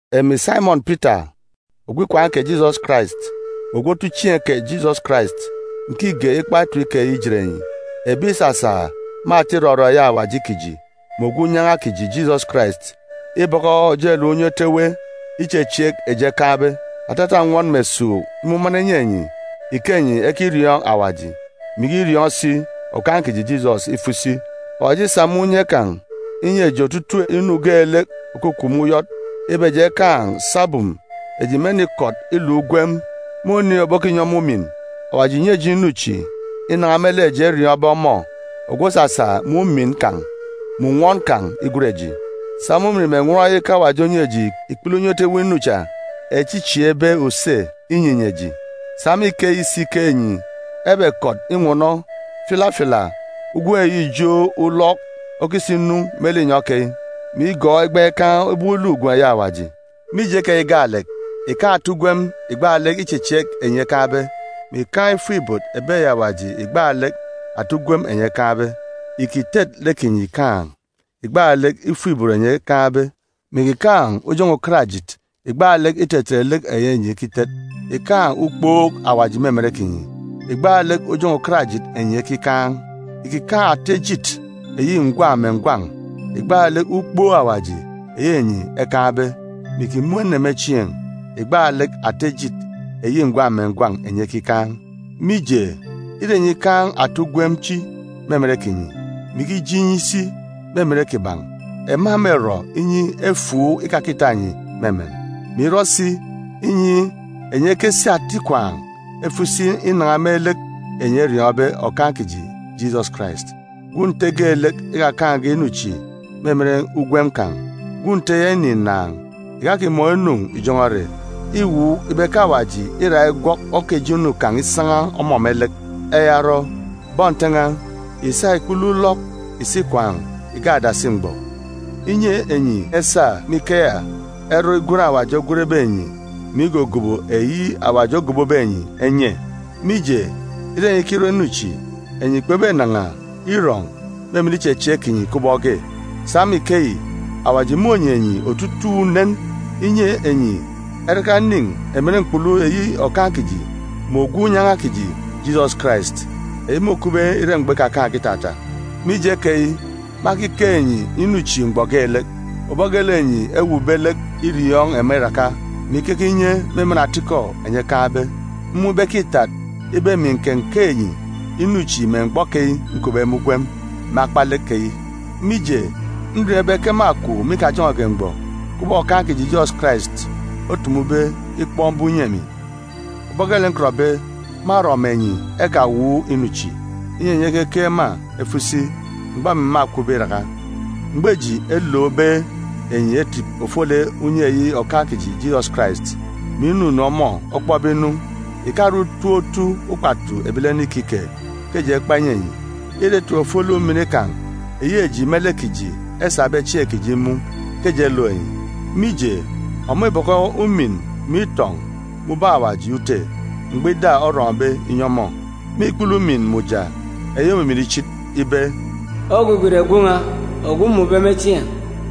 Emi Saimọn Pita, ogwu ikwaan̄ kè Jisọs Karais, mè ogwu otuchieen̄ kè Jisọs Karais, nkige ikpa etip keyi ijet enyi ebi ìsasa me ata irọrọ eyi Awaji kiji mè Ogwu Unyan̄a kiji Jisọs Karais ibọkọ ojelek unye otu ewe ichechieek eji ekaan̄be. Atata nnwọn mè esuuk imumana inyi enyi ike enyi ekiriọọn̄ Awaji, mè ikiriọọn̄ si Okaan̄ kiji Jisọs ifo isi. Awaji îsa me unye kan̄ inyi eji otutuuk inu geelek òkukup me uyọt ibe eji ekaan̄ sabum eji mênikọt iluk ugwem me oniin̄ òbokinyi ọmọ umin. Awaji ìnyi eji inu chi inan̄a me lek eji eriọọn̄be ọmọ ogwu òsasa me umin kan̄ mè nnwọn kan̄ igwen eji. Sa me umin mè nnwọn yi ke Awaji onyi eji ikpele unye otu ewe inu cha echi îchieekbe use inyinyi eji. Sa me ikeyi si ke enyi ebekọt inwọnọ filafila ugwem eyi ijo ulọk okisa inu me linyọn̄ keyi, mè igọọk igbaan̄ ikup ubọk Awaji okupbe. Mije keyi gaalek, ìkaan̄ ata ugwem ìgbaalek ichechieek enyi ekaan̄be, mè ìkaan̄ ifuk-ibot ebi eyi Awaji ìgbaalek ata ugwem enyi ekaan̄be. Ìkitet lek kinyi ìkaan̄ ìgbaalek ifuk-ibot enyi ekaan̄be, mè ìkikaan̄ ujọn̄ọ ukarajit ìgbaalek itetet lek eyi enyi ekitet. Ìkikaan̄ ukpook Awaji me emen kinyi ìgbaalek ujọn̄ọ ukarajit enyi ekikaan̄. Ìkikaan̄ ata ejit eyi ngwan̄ mè ngwan̄ ìgbaalek ukpook Awaji eyi enyi ekikaan̄, mè ìkimun̄ ene me chieen̄ ìgbaalek ata ejit eyi ngwan̄ mè ngwan̄ enyi ekikaan̄. Mije, ire enyi ikaan̄ ata ugwem chi me emen kinyi, mè ikije inyi isi me emen kiban̄, ema mêrọ inyi efuuk ikakita enyi me emen, mè irọ si inyi enyi ekesi ata ikwaan̄ efo isi inan̄a me lek enyi eriọọn̄be Okaan̄ kiji Jisọs Karais. Gwun̄ Nte geelek ikakaan̄ge inu chi me emen ugwem kan̄, gwun̄ Nte ya înin̄ ǹnàan̄, ìkakimọọn̄ inu ìjọn̄ọ ere. Îwuuk ibe ke Awaji îra igwọk oka ijo inu kan̄ isan̄a ọmọ me lek. Eya orọ, bọn Nte n̄a, ìsa ikpele ulọk ìsi ikwaan̄ ìgak adasi mgbọ, inyi enyi esa me ikeya erọ igwen Awaji ogwenbe enyi mè igogobo eyi Awaji ogobobe enyi enye. Mije, ire enyi ikirọ inu chi, enyi kpebenan̄a irọn̄ me emen ichechieek kinyi kubọk ge. Sa me ikeyi, Awaji mônyi enyi otutuuk unen, inyi enyi eraka enin̄ emen mkpulu eyi Okaan̄ kiji mè Ogwu Unyan̄a kiji Jisọs Karais, eyi môkupbe ire mgbọ ikakaan̄ge itata. Mije keyi, mâkikeek enyi inu chi mgbọ geelek, ubọk geelek enyi ewuukbe lek iriọọn̄ ema iraka, mè ikeke inye me emen atikọ enyi ekaan̄be. Mmun̄ ibe ke îtat ibe emi ǹkenkeek enyi inu chi me mgbọ keyi nkupbe me ugwem me akpalek keyi. Mije, nriọọn̄ ibe ke mâkwu me ikajọn̄ọge mgbọ, kubọk Okaan̄ kiji Jisọs Karais otumube ikpọk mbum inyi emi. Ubọk geelek nkọtbe, mârọ mè enyi ekawuuk inu chi, inyi enyi ekekeek ema efo isi mgbọ emi mâkwube iraka. Mgbọ eji elookbe enyi etip ofolek unye eyi Okaan̄ kiji Jisọs Karais, mè inunu ọmọ obokpọk inu, ìkare utop otu ukpatu ebilene ikike ke eji ekpa inyi enyi. Îre etip ofolek umin kan̄ eyi eji me lek kiji esabe chieen̄ kiji imun̄ ke eji elook enyi. Mije, ọmọ îbọkọ umin mè itọn̄ me ubọk Awaji Ute mgbọ ida orọn̄be inyi ọmọ, me ikpele ujamgbugbo eyi òmimin ichit, ibe, “Ogwugwu ìre Gwun̄ n̄a ogwu mmun̄be me chieen̄!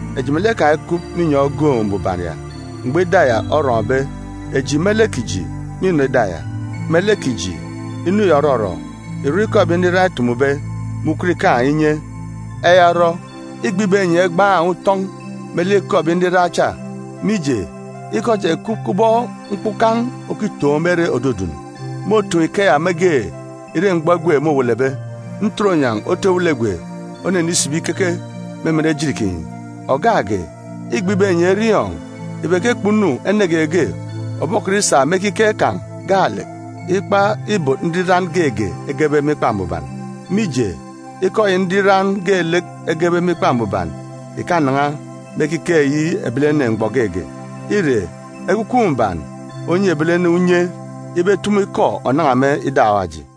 Eji melek kan̄ ekup me inyọn̄ ogoon̄ mbuban ya mgbọ ida ya orọn̄be. Eji me lek kiji mînọ ida ya. Me lek kiji, inu yi òrọrọ îrọ ikọ ebi nriran etumube me ukot ikaan̄ inye. Eya orọ, îgbe ibe enyi egban̄ utọn̄ me lek ikọ ebi nriran cha, mije, ikọ cha ìkup kubọk mkpukan̄ òkitoon̄ me ere òdudun. Môtoon̄ ikeya mege ire mgbọ egwe môwelebe, ntoronyan̄ otu ewelegwe mônenisibi ikeke me emen ejit kinyi. Ògak ge, îgbe ibe enyi eriọọn̄ ibe ke kpunu ene geege òbokọt isa me ekiket kan̄ gaalek ikpa ibot nriran geege egebe me Ikpa Mbuban. Mije, ikọ eyi nriran geelek egebe me Ikpa Mbuban ìkanan̄a me ekiket eyi ebilene mgbọ geege. Îre Ekwukwu Mbuban onyi ebilene unye ibe etumu ikọ ònan̄a me ida Awaji.